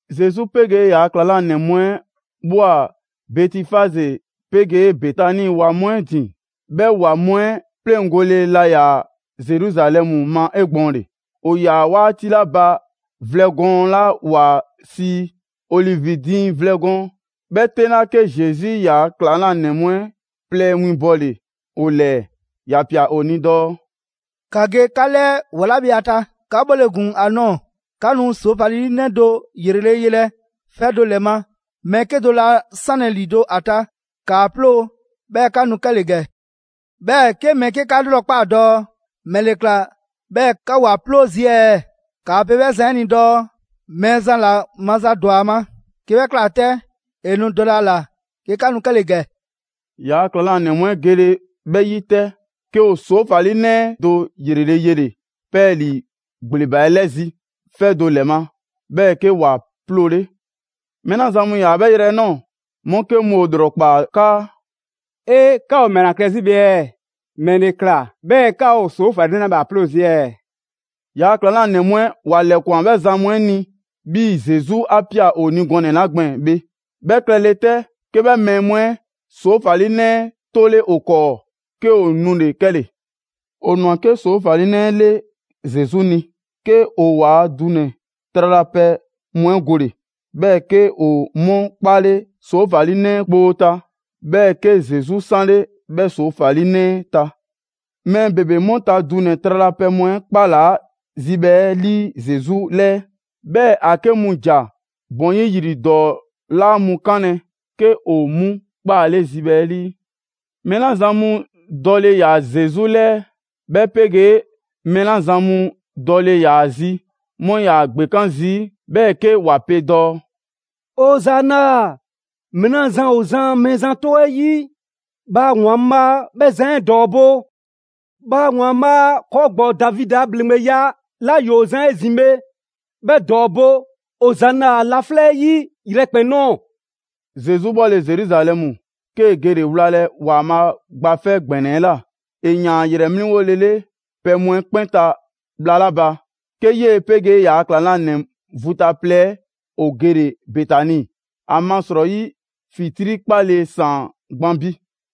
Zesu 'pegee ‑yaa' ‑klaŋlanɛ mu 'ɛ ꞊bhwa Bɛtifaze 'pegee Betani ‑wa mu 'ɛ ‑din. 'Bhɛ ‑wa mu 'ɛ 'pleŋgole laa ‑yaa Zeruzalɛmu ma 'egbɔɔnle. ‑O ‑yaa 'waati 'la ba vlɛ gɔɔn 'la ‑wa sii ‹Olivi diiŋ vlɛ gɔɔn› 'bhɛ 'teŋla‑, 'ke Zesu ‑yaa' ‑klaŋlanɛ mu 'ɛ plɛ winbɔle‑ ‑o ‑lɛɛ. ‑Ya ꞊pia ‑o ni dɔɔ: «‑Ka ge 'ka 'lɛɛ ‑wa 'la bhe ‑a ta, 'ka 'bhɔle‑ ‑gun ‑a nɔɔ‑, 'ka nu ‑soofalinɛ do 'yrele‑ yelɛ 'fɛ do ‑lɛ ma. Mɛɛ 'kedo‑ laa 'sanlɛ ‑lido' ‑a ta, ‑kaa 'ploo‑ 'bhɛɛ‑ 'ka nu 'kɛle‑ ‑gɛ. 'Bhɛɛ‑ 'ke mɛɛ 'ke 'ka 'lrɔkpaa dɔɔ: ‹‑Mɛle ꞊kla 'bhɛɛ‑ 'ka ‑o ‑a 'ploo zii' ɛɛ?› 'Kaa‑ pe 'bhɛ zan 'ɛ ni dɔɔ: ‹Mɛɛzan ‑la maza ‑dwa ‑a ma. 'Ke 'bhɛ ꞊kla 'tɛ, ‑e nu dɔlɛ ‑a ‑la 'ke 'ka nu 'kɛle‑ ‑gɛ.›» ‑Yaa' ‑klaŋlanɛ mu 'ɛ gele 'bhɛ 'yi 'tɛ, 'ke ‑o ‑soofalinɛ do ‑yrele' yele‑ 'pɛɛlii ‑gbleba 'ɛ 'lɛzi‑ 'fɛ do ‑lɛ ma, 'bhɛɛ‑ 'ke ‑wa 'ploole. Mɛɛ 'la zan mu ‑yaa 'bhɛ yrɛ 'ɛ ꞊nɔɔ, 'mu 'ke mu ‑o ‑lrɔkpaa 'kaa: «'E! 'Ka ‑o ‑mɛla klɛ 'zi bhe ɛɛ? ‑Mɛle ꞊kla 'bhɛɛ‑ 'ka ‑o ‑soofalinɛ 'la bhe ‑a 'ploo zii' ɛɛ?» ‑Yaa' ‑klaŋlanɛ mu 'ɛ ‑wa ‑lɛkwan 'bhɛ zan mu 'ɛ ni 'bhii‑ Zesu 'a ꞊pia ‑o ni gɔnɛ‑ 'la gbɛɛn‑ bhe. 'Bhɛ klɛ 'le 'tɛ, 'ke 'bhɛ mɛɛ mu 'ɛ ‑soofalinɛ 'ɛ 'tole ‑o 'kɔɔ, 'ke ‑o nule‑ 'kɛle‑. ‑O ‑nwa 'ke ‑soofalinɛ 'ɛ 'le Zesu ni, 'ke ‑o ‑waa' dunɛ‑ tralapɛ mu 'ɛ gole‑, 'bhɛɛ‑ 'ke ‑o 'mu 'kpaale ‑soofalinɛ 'ɛ kpoo ta, 'bhɛɛ‑ 'ke Zesu 'sanle 'bhɛ ‑soofalinɛ 'ɛ ta. Mɛɛ ‑bebe 'mu ta dunɛ‑ tralapɛ mu 'ɛ 'kpalaa‑ zibhɛ 'ɛ 'lii Zesu 'lɛɛ, 'bhɛɛ‑ ‑a 'ke mu ‑ja ‑bɔn 'yi ‑yri ‑dɔɔ 'laa mu 'kanlɛ‑ 'ke ‑o 'mu 'kpaale zibhɛ 'ɛ 'lii. Mɛɛ 'la zan mu dɔle ‑yaa Zesu 'lɛɛ, 'bhɛ 'pegee mɛɛ 'la zan mu dɔle ‑yaa zi, 'mu 'yaa‑ ‑gbekan' zii' 'bhɛɛ‑ 'ke ‑wa pe dɔɔ: «Ozana! Mɛɛ 'la zan ‑o zan Mɛɛzan 'tɔ 'ɛ 'yi, bhaa ‑Waanbhaa' 'bhɛ zan 'ɛ ‑dɔɔbo'! Bhaa ‑Waanbhaa' ‑kɔɔ' ‑gbɔɔ Davidi a ‑bhleŋgbeya 'la ‑yoo zan 'ezin‑ bhe, 'bhɛ ‑dɔɔbo'! Ozana laflɛ' 'ɛ 'yi yrɛkpɛn‑ ꞊nɔɔ!» Zesu bhɔle Zeruzalɛmu, 'kee‑ gele‑ wlalɛ ‑Waanbhaa' Gba 'Fɛ ‑Gbɛnɛ 'ɛ ꞊la. ‑E ‑yaan ‑a ‑yrɛ 'mliŋgolele pɛ mu 'ɛ 'kpɛn ta bhla 'la ba, 'ke 'yee‑ 'pegee ‑yaa' ‑klaŋlanɛ vu ta plɛ 'ɛ ‑o gele‑ Betani, ‑amasrɔyi ‑fitrii' 'kpale‑ ‑saan gban bi.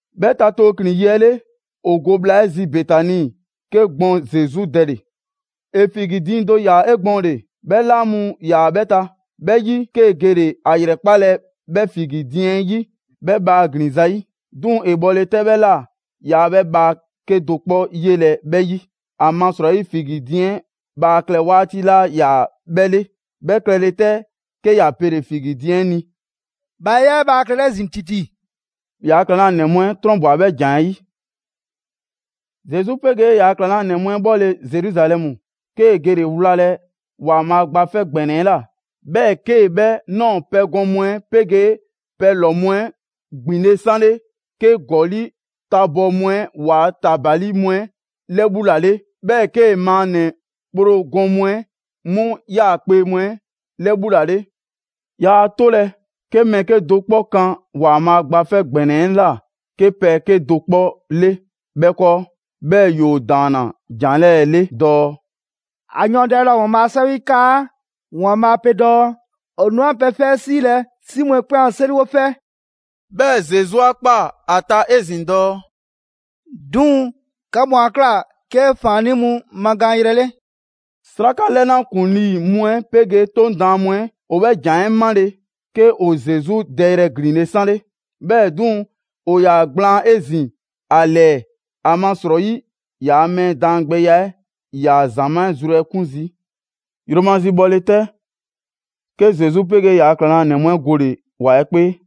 'Bhɛ ta tooklin‑ yi 'ɛ 'le, ‑o go bhla 'ɛ zi Betani, 'ke gbɔn Zesu dɛle‑. ‑E figi diiŋ do ꞊ya 'egbɔɔnle, 'bhɛ 'laa mu ‑yaa 'bhɛ ta. 'Bhɛ 'yi, 'kee‑ gele ‑a ‑yrɛkpalɛ 'bhɛ figi diiŋ 'ɛ 'yi 'bhɛ bhaa ‑glin ‑zayi'. 'Duŋ‑, ‑e bhɔle 'tɛ 'bhɛ ꞊la, yaa 'bhɛ bhaa 'kedo‑ 'kpɔ 'yelɛ‑ 'bhɛ 'yi. ‑Amasrɔyi figi diiŋ bhaa klɛ 'waati 'laa ‑yaa 'bhɛ 'le. 'Bhɛ klɛle 'tɛ, 'ke ‑ya 'pele figi diiŋ 'ɛ ni: «Bhaa 'yaa‑ 'e bhaa klɛlɛ 'ezin‑ ‑titi!» ‑Yaa' ‑klaŋlanɛ mu 'ɛ 'trɔnbwa‑ 'bhɛ ‑jan 'ɛ 'yi. Zesu 'pegee ‑yaa' ‑klaŋlanɛ mu 'ɛ 'bhɔle‑ Zeruzalɛmu, 'kee‑ gele‑ wlalɛ ‑Waanbhaa' Gba 'Fɛ ‑Gbɛnɛ 'ɛ ꞊la. 'Bhɛɛ‑ 'kee‑ 'bhɛ ꞊nɔɔ pɛgɔn mu 'ɛ 'pegee pɛlɔ‑ mu 'ɛ ‑gbinle' 'sanle, 'kee‑ ‑gɔli' tabɔɔ mu 'ɛ waa ‑tabali mu 'ɛ 'lɛbhulale, 'bhɛɛ‑ 'kee‑ maannɛ‑ kpro gɔn mu 'ɛ 'mu 'yaakpe‑ mu 'ɛ 'lɛbhulale. Yaa 'tolɛ‑ 'ke mɛɛ 'kedo‑ 'kpɔ kan ‑Waanbhaa' Gba 'Fɛ ‑Gbɛnɛ 'ɛ ꞊la 'ke pɛ 'kedo‑ 'kpɔ 'le 'bhɛ 'kɔɔ. 'Bhɛɛ‑ ‑yoo ‑daanna ‑jan 'lɛɛ‑ 'le dɔɔ: «‑A yɔɔndɛle laa ‑o ‑Waanbhaa' a 'Sɛwɛ 'ɛ 'yi 'kaa: ‑Waanbhaa' pe dɔɔ: ‹‑O nu 'an pɛ 'fɛ 'ɛ 'siilɛ‑ 'si mu 'ɛ 'kpɛn a 'seriwo 'fɛ.›» 'Bhɛɛ‑ Zesu 'a ꞊kpaa ‑a ta 'ezin‑ dɔɔ: «'Duŋ‑ 'ka mu 'a ꞊kla 'ke ‑faannii' mu magaan yrɛ 'le.» 'Sraka 'lɛna ‑kuŋlii' mu 'ɛ 'pegee 'Toŋ daan mu 'ɛ ‑o 'bhɛ ‑jan 'ɛ 'male‑, 'ke ‑o Zesu dɛyrɛ ‑glinle' 'sanle. 'Bhɛɛ‑ 'duŋ‑, ‑o ‑yaa ‑gblaan 'ezin‑ ‑a ‑lɛɛ, ‑amasrɔyi ‑yaa' mɛɛ daangbɛya 'ɛ 'yaa‑ ‑zamaa' 'ɛ zru 'ɛ 'kun zii'. Yromazi bhɔle 'tɛ, 'ke Zesu 'pegee ‑yaa' ‑klaŋlanɛ mu 'ɛ gole‑ ‑wa 'ɛ 'kpee.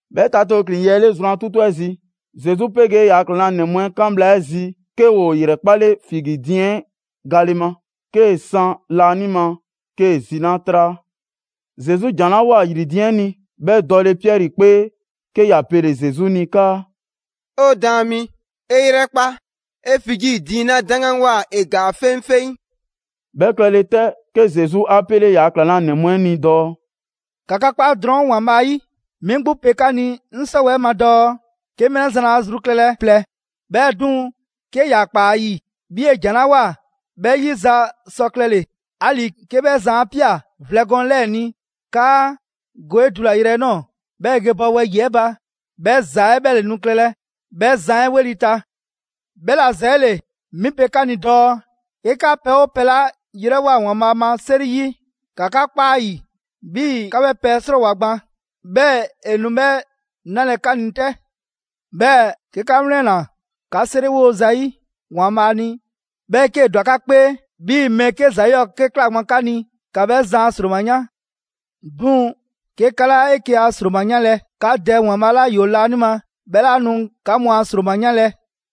Bhɛ ta tooklin‑ yi 'ɛ 'le zrwan 'tutu 'ɛ zi, Zesu 'pegee ‑yaa' ‑klaŋlanɛ mu 'ɛ 'kan bhla 'ɛ zi, 'ke ‑o ‑yrɛkpale figi diiŋ 'ɛ gale ma. 'Kee‑ san laanima, 'kee‑ ‑zinaa' 'traa. Zesu ‑jan 'la ꞊woa ‑yri diiŋ 'ɛ ni, 'bhɛ dɔle Piɛri 'kpee, 'ke ‑ya pele Zesu ni 'kaa: «'O Daan mi, 'e 'yrɛkpa, 'e figi diiŋ 'la 'daŋganwoa ‑e ‑gaa 'feŋfeŋ.» 'Bhɛ klɛle 'tɛ, 'ke Zesu 'a 'pele ‑yaa' ‑klaŋlanɛ mu 'ɛ ni dɔɔ: «‑Ka 'ka 'kpa drɔŋ ‑Waanbhaa' ‑yi! 'Mi 'gbu pe 'ka ni 'ŋ 'sɔwɛɛ‑ 'ɛ ma dɔɔ 'ke mɛɛ 'la zan laa zru klɛlɛ plɛ, 'bhɛɛ‑ 'duŋ‑, 'ke ‑ya ꞊kpaa ‑a ‑yi 'bhii‑ ‑e ‑jan 'la ꞊woa 'bhɛ 'yiza‑ sɔ klɛle‑, 'ali‑ 'ke 'bhɛ zan 'a ꞊pia vlɛ gɔɔn 'lɛɛ‑ ni 'kaa: ‹Go 'e dulayrɛ 'ɛ ꞊nɔɔ, 'bhɛɛ‑ ge bɔ wɛyi‑ 'ɛ ba›. 'Bhɛ ‑za 'ɛ 'bhɛ ‑le nu klɛlɛ 'bhɛ zan 'ɛ 'weli‑ ta. 'Bhɛla‑ ‑zɛɛle, 'mi pe 'ka ni dɔɔ 'ke 'ka pɛ 'oo pɛ 'la 'yrɛwoa‑ ‑Waanbhaa' ma 'seri 'yi, ‑ka 'ka 'kpa 'a ‑yi 'bhii‑ 'ka 'bhɛ pɛ 'ɛ 'srɔɔwoa‑ gban, 'bhɛɛ‑ ‑e nu 'bhɛ 'nalɛ‑ 'ka ni 'tɛ. 'Bhɛɛ‑ 'ke 'ka 'wlɛnna‑ 'ka 'seriwo zayi' ‑Waanbhaa' ni, 'bhɛɛ‑ 'kee‑ ‑dwa 'ka 'kpee 'bhii‑ mɛɛ 'ke ‑za 'yɔɔ‑ 'ke ꞊kla gban 'ka ni, ‑ka 'bhɛ zan a ‑sroma 'yan. ['Duŋ‑, 'ke 'ka 'laa 'eke‑ a ‑sroma 'yanlɛ‑, 'ka Dɛ ‑Waanbhaa' 'la ‑yoo laanima, 'bhɛ 'laa nu 'ka mu a ‑sroma 'yanlɛ‑.]»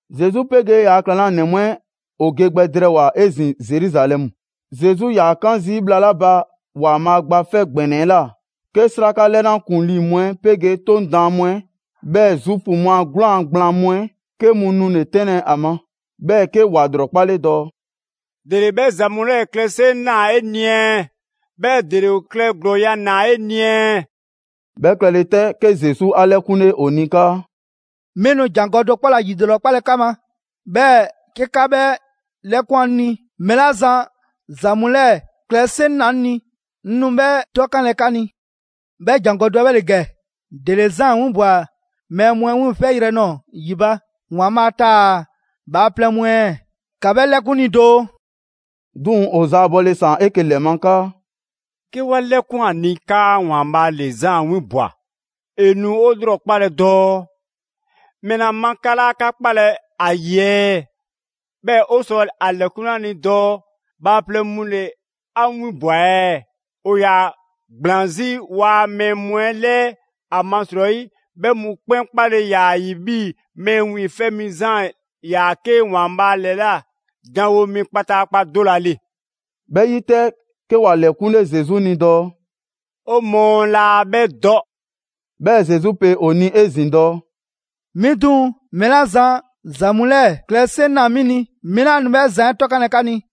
Zesu 'pegee ‑yaa' ‑klaŋlanɛ mu 'ɛ ‑o ge gbɛ drɛɛwoa‑ 'ezin‑ Zeruzalɛmu. Zesu 'yaa‑ 'kaan zii' bhla 'la ba ‑Waanbhaa' Gba 'Fɛ ‑Gbɛnɛ 'ɛ ꞊la, 'ke 'sraka 'lɛna ‑kuŋlii' mu 'ɛ 'pegee 'Toŋ daan mu 'ɛ, 'bhɛɛ‑ Zuufu mu a 'gwlaan‑ gblaan mu 'ɛ 'ke mu nule‑ 'tɛnlɛ‑ ‑a ma. 'Bhɛɛ‑ 'ke ‑wa ‑lrɔkpale dɔɔ: «‑Dele 'bhɛ ‑za mu 'lɛɛ‑ klɛ 'seŋ ꞊naa 'e ni ɛɛ? 'Bhɛɛ‑ ‑dele ‑o klɛ ‑glɔɔya' ꞊naa 'e ni ɛɛ?» 'Bhɛ klɛle 'tɛ, 'ke Zesu 'a 'lɛkunle ‑o ni 'kaa: «'Mi nu ‑jangɔ' do 'kpɔ ‑la ‑yilrɔkpalɛ 'ka ma, 'bhɛɛ‑ 'ke 'ka 'bhɛ 'lɛkwan‑ 'ŋ ni, mɛɛ 'la zan ‑za mu 'lɛɛ‑ klɛ 'seŋ ꞊naa 'ŋ ni, 'ŋ nu 'bhɛ 'tɔkanlɛ 'ka ni. 'Bhɛ ‑jangɔ' do 'ɛ bhɛ ‑le ‑gɛ: ‑Dele Zaan 'winbwa‑ mɛɛ mu 'ɛ wiiŋfɛyrɛ nɔɔ‑ ‑yi ba, ‑Waanbhaa' taa‑ bhaaplɛŋ mu 'ɛ ɛɛ? ‑Ka 'bhɛ 'lɛkun 'ŋ ni doo!» 'Duŋ‑ ‑o zaabɔle ꞊saan 'eke‑ ‑lɛ ma 'kaa: «'Ke 'wa 'lɛkwan‑ ‑a ni 'kaa ‑Waanbhaa' ‑le Zaan 'winbwa‑, ‑e nu 'o 'lrɔkpalɛ dɔɔ: ‹‑Mɛla ma 'ka 'laa 'ka 'kpalɛ‑ ‑a ‑yi ɛɛ?› 'Bhɛɛ‑ 'o sɔ ‑a ‑lɛkunle ‑a ni dɔɔ: ‹Bhaaplɛŋ mu ‑le 'a 'winbwa‑ ɛɛ?› ‑O ‑yaa ‑gblaan 'zi ‑waa' mɛɛ mu 'ɛ 'lɛɛ, ‑amasrɔyi 'bhɛ mu 'kpɛn 'kpale‑ ‑yaa ‑a ‑yi 'bhii‑ Mɛɛ Wiiŋfɛ' Mi Zaan ‑yaa 'ke ‑Waanbhaa' ‑lɛla' janwo mi kpataakpa do ‑la ‑le.» 'Bhɛ 'yi 'tɛ, 'ke ‑wa ‑lɛkunle Zesu ni dɔɔ: «'O mɔɔ laa 'bhɛ dɔ.» 'Bhɛɛ‑ Zesu pe ‑o ni 'ezin‑ dɔɔ: «'Mi 'duŋ‑, mɛɛ 'la zan ‑za mu 'lɛɛ‑ klɛ 'seŋ ꞊naa 'mi ni, 'mi laa nu 'bhɛ zan 'ɛ 'tɔkanlɛ 'ka ni.»